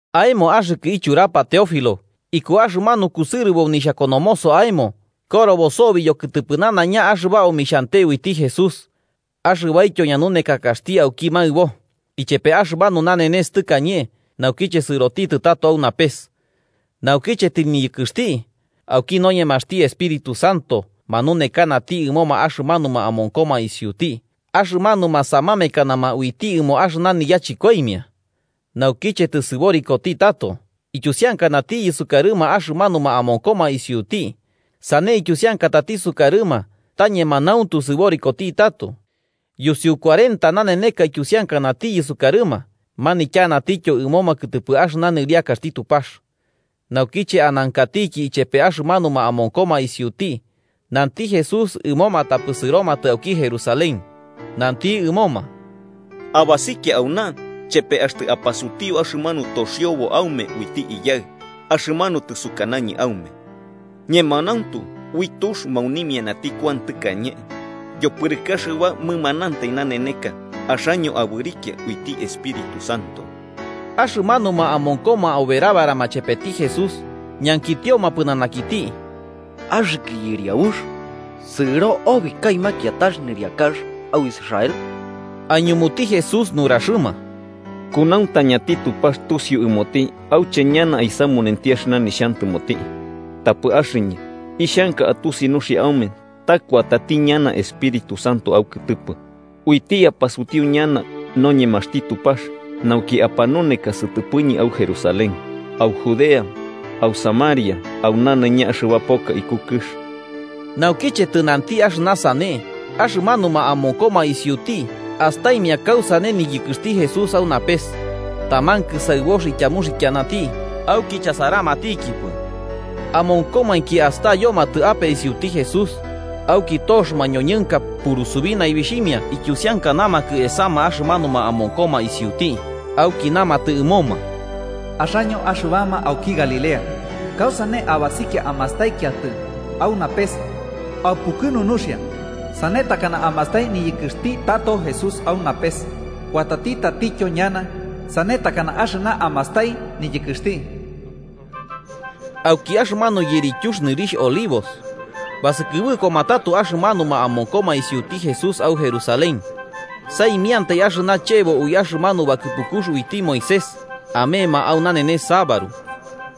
Aemo axɨkɨ ichurapa Teófilo: Iku axɨmanu kusɨrɨbo nixhakonomoso aemo korobo sobi yokɨtɨpɨ nanaiña axɨba omixhante uiti Jesús, axɨbaityo ñanunekakaxti auki maɨbo ichepe axɨmanu nanenes tɨkañe naukiche sɨrotitɨ tato au napes. Naukiche tɨniyɨkɨxti, auki noñemaxti Espíritu Santo manunekanati ɨmoma axɨmanuma amonkoma isiuti axɨmanuma samamekanama uiti ɨmo axɨna niyachɨkoimia. Naukiche tɨsɨborikoti tato ityusiankanatiyɨ sukarɨma axɨmanuma amonkoma isiuti, sane ityusiankatati sukarɨma ta ñemanauntu sɨborikoti tato. Yusiu cuarenta naneneka ityusiankanatiyɨ sukarɨma manityanatityo ɨmoma kɨtɨpɨ axɨna nɨriakaxti Tupax. Naukiche anankatiki ichepe axɨmanuma amonkoma isiuti, nanti Jesús ɨmoma tapɨ sɨromatɨ auki Jerusalén. Nanti ɨmoma: –Abasikia auna chepe axtɨ apasutiu axɨmanu toxiobo aume uiti Iyaɨ, axɨmanu tɨsukanañɨ aume. Ñemanauntu ui tux maunimianati Kuan tɨkañe, yopɨrɨkɨ axɨba mɨmanantai naneneka axaño abɨrikia uiti Espíritu Santo. Axɨmanuma amonkoma oberabarama chepeti Jesús, ñankitioma pɨnanakiti: –Axɨkɨ Yɨriabux, ¿sɨro obi kaɨma kiatax nɨriakax au Israel? Aiñumuti Jesús nuraxɨma: –Kunauntañati Tupax tusiu ɨmoti auche ñana aisamunenti axɨna nixhantɨmoti. Tapɨ axɨñɨ ixhanka atusi nuxia aume ta kuatati ñana Espíritu Santo aukɨtɨpɨ, uiti apasutiu ñana noñemaxti Tupax nauki apanuneka sɨtɨpɨñɨ au Jerusalén, au Judea, au Samaria, au nanaiña axɨba poka iku kɨx. Naukiche tɨnanti axɨna sane, axɨmanuma amonkoma isiuti astaimia kausane niyɨkɨxti Jesús au napes, taman kɨsaɨbox ityamuxikianati auki chasaramatɨkipɨ. Amonkomainki astayomatɨ ape isiuti Jesús, auki tox mañoñɨnka purusubi naibixhimia ityusiankanamakɨ esama axɨmanuma amonkoma isiuti auki namatɨ ɨmoma: –Axaño axɨbama auki Galilea, ¿kausane abasikia amastaikiatɨ au napes? ¡Aupukɨnu nuxia! Sane takana amastai niyɨkɨxti tato Jesús au napes, kuatati tatityo ñana sane takana axɨna amastai niyɨkɨxti. Auki axɨmanu yirityux nɨrixh Olivos, basɨkɨbɨkoma tato axɨmanuma amonkoma isiuti Jesús au Jerusalén: saimiantai, axɨna chebo ui axɨmanu bakɨpukux uiti Moisés amema au nanenes sabaru.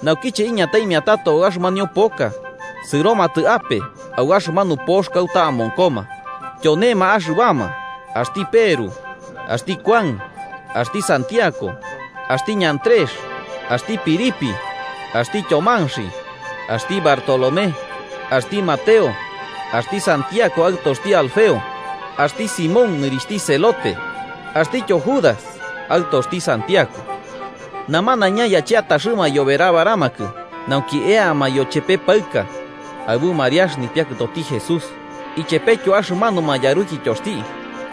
Naukiche iñataimia tato au axɨmanio poka, sɨromatɨ ape au axɨmanu pox kauta amonkoma. Tyonema axɨbama, axti Peru, axti Kuan, axti Santiago, axti Andrés, axti Felipe, axti Tyomanxi, axti Bartolomé, axti Mateo, axti Santiago aɨtoxti Alfeo, axti Simón nɨrixhti Celote axtityo Judas aɨtoxti Santiago. Namanaiña yacheataxɨma aiyoberabaramakɨ nauki eama yochepe paɨka, aɨbu Mariax, nipiakɨtoti Jesús, ichepetyo axɨmanuma yarukityoxti.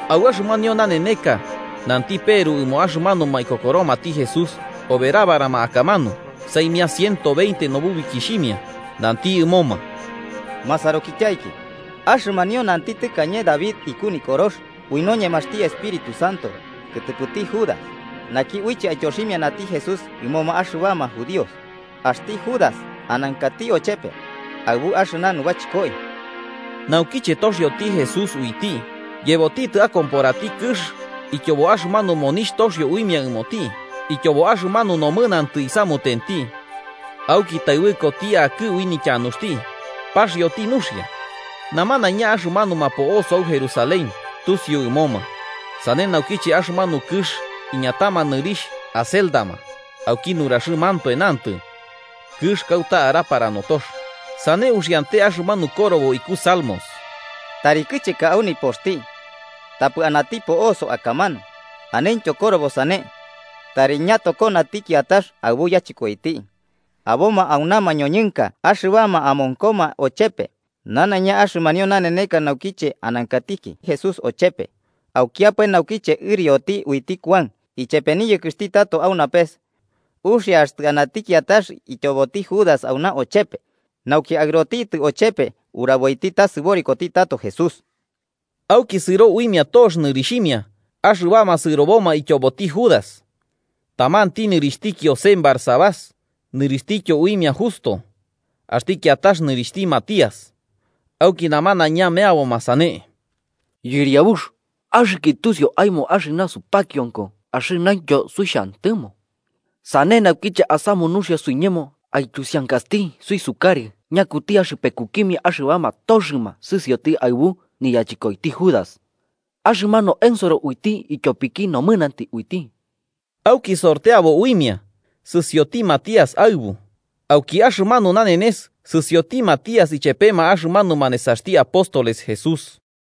Au axɨmanio naneneka nanti Peru ɨmoma axɨmanuma ikokoromati Jesús oberabarama akamanu, saimia ciento veinte nububikixhimia, nanti ɨmoma: “Masarukityaiki, axɨmanio nanti tɨkañe David iku Nikorox ui noñemaxti Espíritu Santo, kɨtɨpɨti Judas, naki uiche aityoximianati Jesús ɨmoma axɨbama judíos. Axti Judas anankati ochepe, aɨbu axɨna nubachɨkoi. Naukiche toxioti Jesús uiti, yebotitɨ akomporati kɨx ityobo axɨmanu monixh toxio uimia ɨmoti ityobo axɨmanu nomɨnantɨ isamutenti. Auki taɨbɨkoti akɨ ui nityanuxti, paxioti nuxia. Namanaiña axɨmanuma po'osoma au Jerusalén tusiu ɨmoma, sane naukiche axɨmanu kɨx iñatama nɨrixh Hacéldama, auki nuraxɨmantoe nantɨ: ‘Kɨx kauta arapara notox.’ Sane uxiante axɨmanu korobo iku Salmos: ‘Tari kɨcheka au nipoxti, tapɨ anati po'oso akamanu.’ Aneityo korobo sane: ‘Tari ñatokonati kiatax aɨbu yachɨkoiti.’ “Aboma auna mañoñɨnka axɨbama amonkoma ochepe nanaiña axɨmanio naneneka naukiche anankatiki Jesús ochepe, aukiapae naukiche ɨrioti uiti Kuan ichepe niyɨkɨxti tato au napes. Uxia axtɨ anati kiatax ityoboti Judas auna ochepe, nauki aɨrotitɨ ochepe uraboiti ta sɨborikoti tato Jesús.” Auki sɨro uimia tox nɨrixhimia axɨbama sɨroboma ityoboti Judas. Tamanti nɨrixhti Kiosen Barsabás, nɨrixhtityo uimia Justo, axti kiatax nɨrixhti Matías. Auki namanaiña meaboma sane: “Yɨriabux, axɨkɨ tusiu aemo axɨna supakionko axɨnaintyo suixhantɨmo. Sane naukiche asamu nuxia suiñemo aityusiankasti suisukarɨ ñakuti axɨpekukimia axɨbama toxɨma sɨsioti aɨbu niyachɨkoiti Judas, axɨmanu ensoro uiti ityopiki nomɨnantɨ uiti.” Auki sorteabo uimia, sɨsioti Matías aɨbu, auki axɨmanu nanenes sɨsioti Matías ichepema axɨmanuma nesaxti apóstoles Jesús